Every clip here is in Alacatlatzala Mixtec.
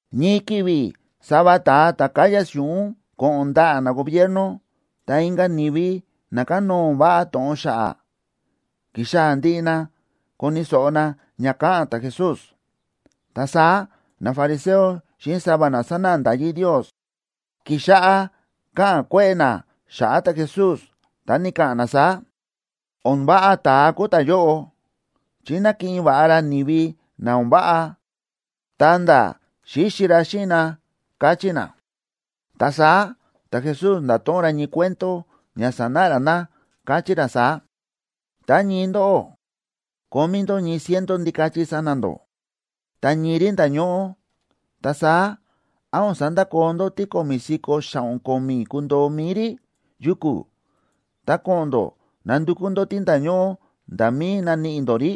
Ñii ki̱vi̱ sava ta̱a ta̱ káya si̱ꞌún ko̱ꞌo̱n ndaꞌa̱ nagobierno, ta inka̱ ni̱vi na kánóo o̱n váꞌa to̱ꞌon xa̱ꞌa̱, ki̱xaa̱ ndiꞌi na koni̱ so̱ꞌo na ña káꞌa̱n ta̱Jesús. Ta saá nafariseo xíꞌin sava na sánáꞌa nda̱yí Ndios, ki̱xáꞌá káꞌa̱n kue̱ꞌe̱ na xa̱ꞌa̱ ta̱Jesús, ta ni̱ka̱ꞌa̱n na saá: ―O̱n váꞌa ta̱a kúu ta̱yóꞌo, chi nákiꞌin va̱ꞌa ra ni̱vi na o̱n váꞌa, ta̱nda̱ xíxi ra xíꞌin na ―káchí na. Ta saá ta̱Jesús nda̱to̱ꞌon ra ñii cuento ña sanáꞌa ra na, káchí ra saá: ―Tá ñii ndóꞌó kómí ndó ñii ciento ndikachi sa̱na̱ ndó, ta ñii rí nda̱ñóꞌó, ta saá, ¿án o̱n sandakoo ndó tí ko̱mi̱ si̱ko̱ xa̱ꞌo̱n ko̱mi̱ kundoo mi̱i rí yuku̱, ta ko̱ꞌo̱n ndó nandukú ndó tí nda̱ñóꞌó nda̱ mí naníꞌi ndó rí?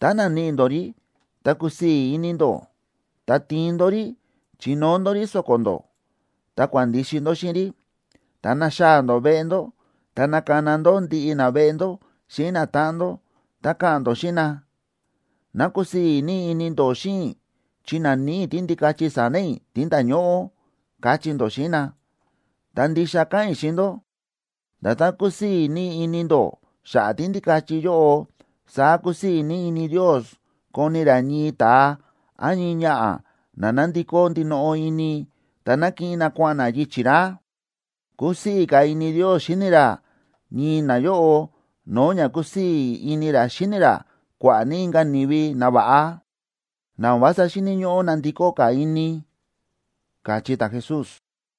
Tá naníꞌi ndó rí, ta kusii̱ ini ndó, ta tiin ndó rí chinóo ndó rí so̱ko̱ ndó, ta kua̱n ndixi ndó xíꞌin rí. Tá naxaa̱ ndó veꞌe ndó, ta nakana ndó ndiꞌi naveꞌe ndó xíꞌin natáꞌan ndó, ta ka̱ꞌa̱n ndó xíꞌin na: “Ná kusii̱ ní ini ndó xíꞌin i̱ chi na̱níꞌi i̱ tíndikachi sa̱na̱ i̱ tí nda̱ñóꞌó”, kachí ndó xíꞌin na. Ta ndixa káꞌa̱n i̱ xíꞌin ndó, nda̱tán kusii̱ ní ini ndó xa̱ꞌa̱ tíndikachi yóꞌo, saá kusii̱ ní ini Ndios koni ra ñii ta̱a án ñii ñaꞌa̱ na na̱ndikó ndinoꞌo ini, ta na̱kiꞌin na kua̱ꞌa̱n na yichi̱ ra. Kúsii̱ ka̱ ini Ndios xíni ra ñii nayóꞌo no̱o̱ ña kúsii̱ ini ra xíni ra kua̱ꞌa̱ ní inka̱ ni̱vi nava̱ꞌa, na o̱n vása xíni̱ ñóꞌó nandikó ka̱ ini ―káchí ta̱Jesús.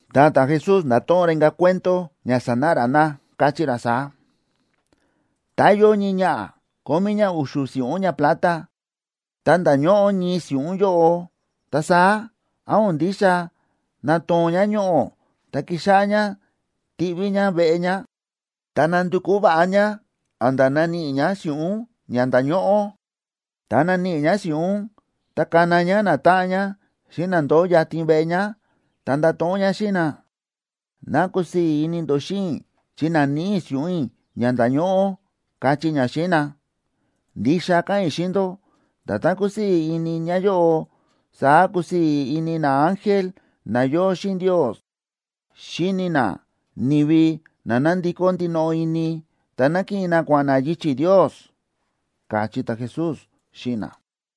Ta ta̱Jesús nda̱to̱ꞌon ra inka̱ cuento ña sanáꞌa ra na, káchí ra saá: ―Tá yóo ñii ñaꞌa̱ kómí ñá u̱xu̱ si̱ꞌún ñaplata,a ta nda̱ñóꞌó ñii si̱ꞌún yóꞌo, ta saá, ¿án o̱n ndixa natoo̱n ñá ñoꞌo̱, ta kixáꞌá ñá tiꞌví ñá veꞌe ñá, ta nandukú va̱ꞌa ñá a̱nda̱ naníꞌi ñá si̱ꞌún ña nda̱ñóꞌó? Tá naníꞌi ñá si̱ꞌún, ta kana ñá natáꞌan ñá xíꞌin na ndóo yatin veꞌe ñá, ta ndato̱ꞌon ñá xíꞌin na: “Ná kusii̱ ini ndó xíꞌin i̱ chi na̱níꞌi i̱ si̱ꞌún i̱ ña nda̱ñóꞌó”, kachí ñá xíꞌin na. Ndixa káꞌa̱n i̱ xíꞌin ndó, nda̱tán kúsii̱ ini ñáyóꞌo, saá kúsii̱ ini naángel na yóo xíꞌin Ndios xíni na ni̱vi na na̱ndikó ndinoꞌo ini, ta na̱kiꞌin na kua̱ꞌa̱n na yichi̱ Ndios ―káchí ta̱Jesús xíꞌin na.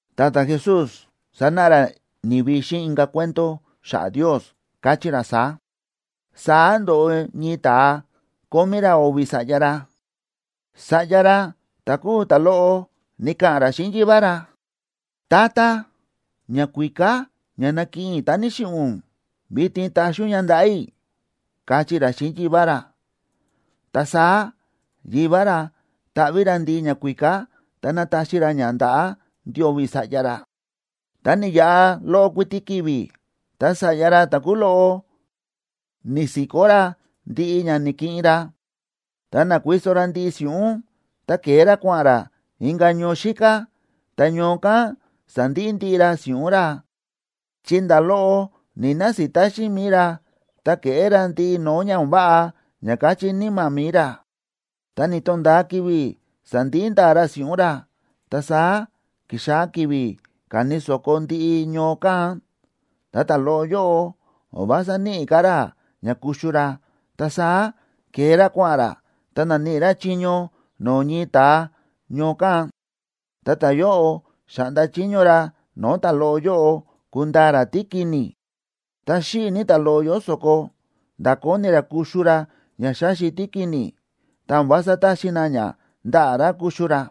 Ta ta̱Jesús sa̱náꞌa ra ni̱vi xíꞌin inka̱ cuento xa̱ꞌa̱ Ndios, káchí ra saá: ―Saá ndo̱ꞌo ñii ta̱a, kómí ra o̱vi̱ sa̱ꞌya ra. Sa̱ꞌya ra ta̱ kúu ta̱loꞌo ni̱ka̱ꞌa̱n ra xíꞌin yivá ra: “Tata, ñakuíká ña nakiꞌin i̱ tá ni̱xiꞌi̱ ún, vitin taxi ún ña ndaꞌa̱ i̱”, káchí ra xíꞌin yivá ra. Ta saá yivá ra ta̱ꞌví ra ndiꞌi ñakuíká, ta na̱taxi ra ña ndaꞌa̱ ndio̱vi̱ sa̱ꞌya ra. Ta ni̱yaꞌa loꞌo kuiti ki̱vi̱, ta sa̱ꞌya ra ta̱ kúu loꞌo ni̱si̱kó ra ndiꞌi ña na̱kiꞌin ra, ta na̱kuiso ra ndiꞌi si̱ꞌún, ta ke̱e ra kua̱ꞌa̱n ra inka̱ ñoo xíká. Ta ñoo kán sa̱ndiꞌi ndiꞌi ra si̱ꞌún ra, chi nda̱ loꞌo ni̱‑nasita xíꞌin mi̱i ra, ta ke̱ꞌé ra ndiꞌi no̱o̱ ña o̱n váꞌa ña káchí níma̱ mi̱i ra. Ta ni̱to̱nda̱a ki̱vi̱ sa̱ndiꞌi nda̱a̱ ra si̱ꞌún ra, ta saá ki̱xaa̱ ki̱vi̱ káni so̱ko ndiꞌi ñoo kán. Ta ta̱loꞌo yóꞌo, o̱n vása níꞌi ka̱ ra ña kuxu ra. Ta saá ke̱e ra kua̱ꞌa̱n ra, ta na̱níꞌi ra chiño no̱o̱ ñii ta̱a ñoo kán. Ta ta̱yóꞌo xa̱ꞌnda chiño ra no̱o̱ ta̱loꞌo yóꞌo kundaa ra tíkini̱. Ta xíꞌi̱ ní ta̱loꞌo yóꞌo so̱ko, nda̱ kóni ra kuxu ra ña xáxi tíkini̱, ta o̱n vása táxi na ña ndaꞌa̱ ra kuxu ra.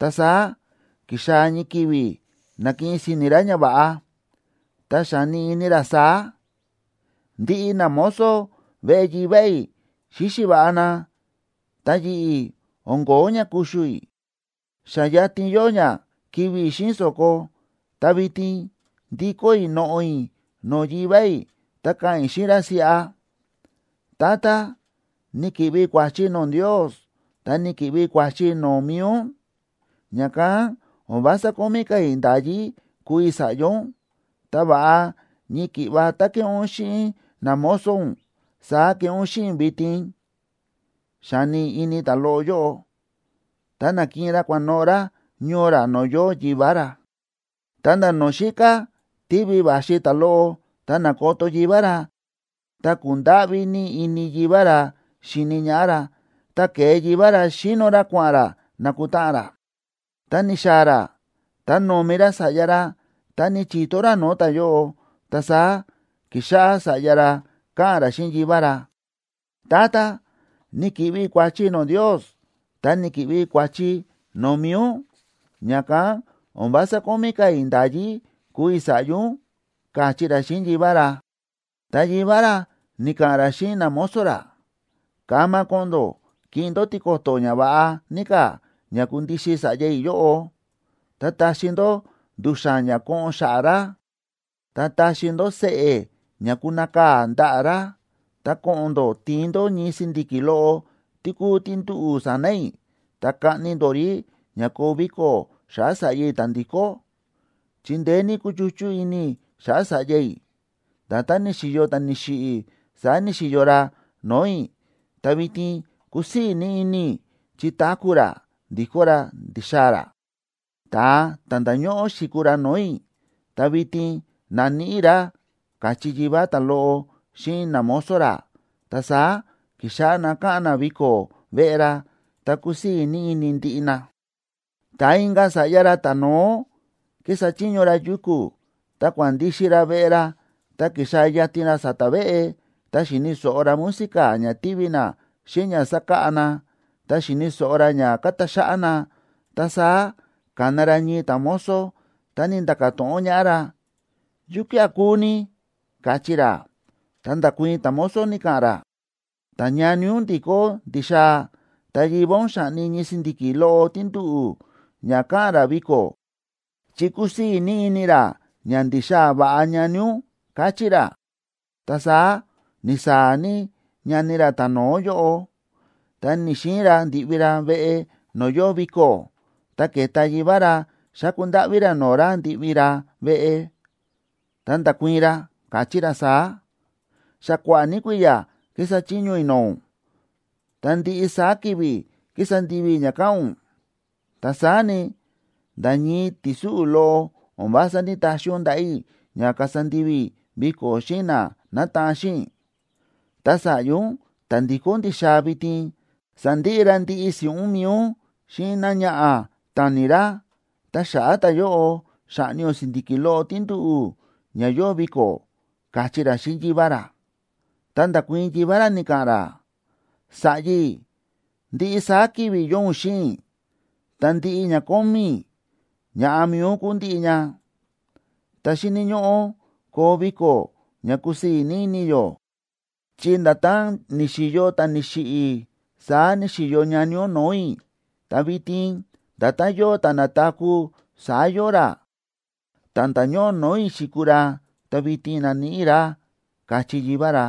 Ta saá ki̱xaa̱ ñii ki̱vi̱ na̱kiꞌin si̱ni̱ ra ñava̱ꞌa, ta xáni ini ra saá: “Ndiꞌi namozo veꞌe yivá i̱ xíxi va̱ꞌa na, ta yi̱ꞌi̱, o̱n ko̱ó ña kuxu i̱, xa yatin yóo ña kivi̱ i̱ xíꞌin so̱ko. Ta vitin ndikó i̱ noꞌo̱ i̱ no̱o̱ yivá i̱, ta ka̱ꞌa̱n i̱ xíꞌin ra siꞌa: Tata, ni̱ki̱ꞌvi i̱ kua̱chi no̱o̱ Ndios ta ni̱ki̱ꞌvi i̱ kua̱chi no̱o̱ mi̱i ún. Ña̱kán o̱n vása kómí ka̱ i̱ nda̱yí kuu i̱ sa̱ꞌya ún, ta va̱ꞌa ñii ki̱ꞌva tá kéꞌé ún xíꞌin namozo ún, saá keꞌé ún xíꞌin i̱ vitin”, xáni ini ta̱loꞌo yóꞌo. Ta na̱kiꞌin ra kua̱noꞌo̱ ra ñoo ra no̱o̱ yóo yivá ra. ’Ta nda̱ no̱o̱ xíká tívi va̱xi ta̱loꞌo, ta na̱koto yivá ra, ta ku̱ndáꞌví ní ini yivá ra xi̱ni ñaꞌá ra, ta ke̱e yivá ra xíno ra kua̱ꞌa̱n ra nakutáꞌan ra. Tá ni̱xaa̱ ra, ta no̱mi ra sa̱ꞌya ra, ta ni̱chi̱to ra no̱o̱ ta̱yóꞌo. Ta saá ki̱xáꞌá sa̱ꞌya ra káꞌa̱n ra xíꞌin yivá ra: “Tata, ni̱ki̱ꞌvi i̱ kua̱chi no̱o̱ Ndios, ta ni̱ki̱ꞌvi i̱ kua̱chi no̱o̱ mi̱i ún. Ña̱kán o̱n vása kómí ka̱ i̱ nda̱yí kuu i̱ sa̱ꞌya ún”, káchí ra xíꞌin yivá ra. Ta yivá ra ni̱ka̱ꞌa̱n ra xíꞌin namozo ra: “Kama ko̱ꞌo̱n ndó kiꞌin ndó tiko̱to̱ ñava̱ꞌa ní ka̱ ña kundixin sa̱ꞌya i̱ yóꞌo, ta taxi ndó ndu̱xa̱n ña koꞌon xa̱ꞌa̱ ra, ta taxi ndó seꞌe̱ ña kunakaa̱ ndaꞌa̱ ra. Ta ko̱ꞌo̱n ndó tiin ndó ñii si̱ndi̱ki̱ loꞌo tí kúu tí nduꞌu̱ sa̱na̱ i̱, ta kaꞌni ndó rí ña koo viko̱ xa̱ꞌa̱ sa̱ꞌya i̱ ta̱ ndi̱kó. Chi ndeé ní kúchuchú ini i̱ xa̱ꞌa̱ sa̱ꞌya i̱, nda̱tán ni̱xi̱yo ta̱ ni̱xiꞌi̱ saá ni̱xi̱yo ra no̱o̱ i̱, ta vitin kúsii̱ ní ini i̱, chi táku̱ ra ndi̱kó ra ndi̱xaa̱ ra. Ta̱a ta̱ nda̱ñóꞌó xi̱kuu ra no̱o̱ i̱, ta vitin na̱níꞌi i̱ ra”, káchí yivá ta̱loꞌo xíꞌin namozo ra. Ta saá ki̱xáꞌá na káꞌa̱n na viko̱ veꞌe ra, ta kúsii̱ ní ini ndiꞌi na. ’Ta inka̱ sa̱ꞌya ra ta̱no̱ó kísa chiño ra yuku̱, ta kua̱n ndixi ra veꞌe ra, ta ki̱xaa̱ yatin ra sa̱ta̱ veꞌe, ta xi̱ni̱ so̱ꞌo ra música ña tívi na xíꞌin ña sákáꞌa na, ta xi̱ni̱ so̱ꞌo ra ña káta xáꞌá na. Ta saá ka̱na ra ñii ta̱mozo, ta ni̱nda̱ka̱ to̱ꞌon ñaꞌá ra: “¿Yukía̱ kúu ni?”, káchí ra. Ta nda̱kuii̱n ta̱mozo, ni̱ka̱ꞌa̱n ra: “Ta ñani ún ndi̱kó ndi̱xaa̱, ta yivá ún xa̱ꞌni ñii si̱ndi̱ki̱ loꞌo tí nduꞌu̱ ña ka̱ꞌa̱n ra viko̱, chi kúsii̱ ní ini ra ña ndi̱xaa̱ va̱ꞌa ñani ún”, káchí ra. Ta saá ni̱saa̱ ní ñani ra ta̱no̱ó yóꞌo, ta ni̱‑xiin ra ndi̱ꞌvi ra veꞌe no̱o̱ yóo viko̱. Ta ke̱ta yivá ra xáku ndáꞌví ra no̱o̱ ra ndi̱ꞌvi ra veꞌe. Ta nda̱kuii̱n ra, káchí ra saá: “Xa kua̱ꞌa̱ ní kui̱ya̱ ki̱sa chiño i̱ no̱o̱ ún, ta ndiꞌi saá ki̱vi̱ ki̱sa ndivi i̱ ña káꞌa̱n ún. Ta saá ni, nda̱ ñii ti̱súꞌu̱ loꞌo o̱n vása ní‑taxi ún ndaꞌa̱ i̱ ña kasa ndivi i̱ viko̱ xíꞌin na nátaꞌan xíꞌin i̱. Ta sa̱ꞌya ún ta̱ ndi̱kó ndi̱xaa̱ vitin, sa̱ndiꞌi ra ndiꞌi si̱ꞌún mi̱i ún xíꞌin náñaꞌa̱ ta̱ni̱ ra, ta xa̱ꞌa̱ ta̱yóꞌo xa̱ꞌni ún si̱ndi̱ki̱ loꞌo tí nduꞌu̱ ña yóo viko̱”, káchí ra xíꞌin yivá ra. Ta nda̱kuii̱n yivá ra, ni̱ka̱ꞌa̱n ra: “Sa̱ꞌya i̱, ndiꞌi saá ki̱vi̱ yóo ún xíꞌin i̱, ta ndiꞌi ña kómí i̱, ña̱ꞌa mi̱i ún kúu ndiꞌi ña. Ta xíni̱ ñóꞌó koo viko̱ ña kúsii̱ ní ini yó, chi nda̱tán ni̱xi̱yo ta̱ ni̱xiꞌi̱ saá ni̱xi̱yo ñani ún no̱o̱ i̱, ta vitin nda̱tán yóo ta̱ na̱taku̱ saá yóo ra. Ta̱ nda̱ñóꞌó no̱o̱ i̱ xi̱kuu ra, ta vitin na̱níꞌi i̱ ra”, káchí yivá ra.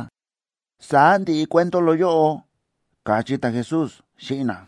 Saá ndi̱ꞌi cuento loꞌo yóꞌo ―káchí ta̱Jesús xíꞌin na.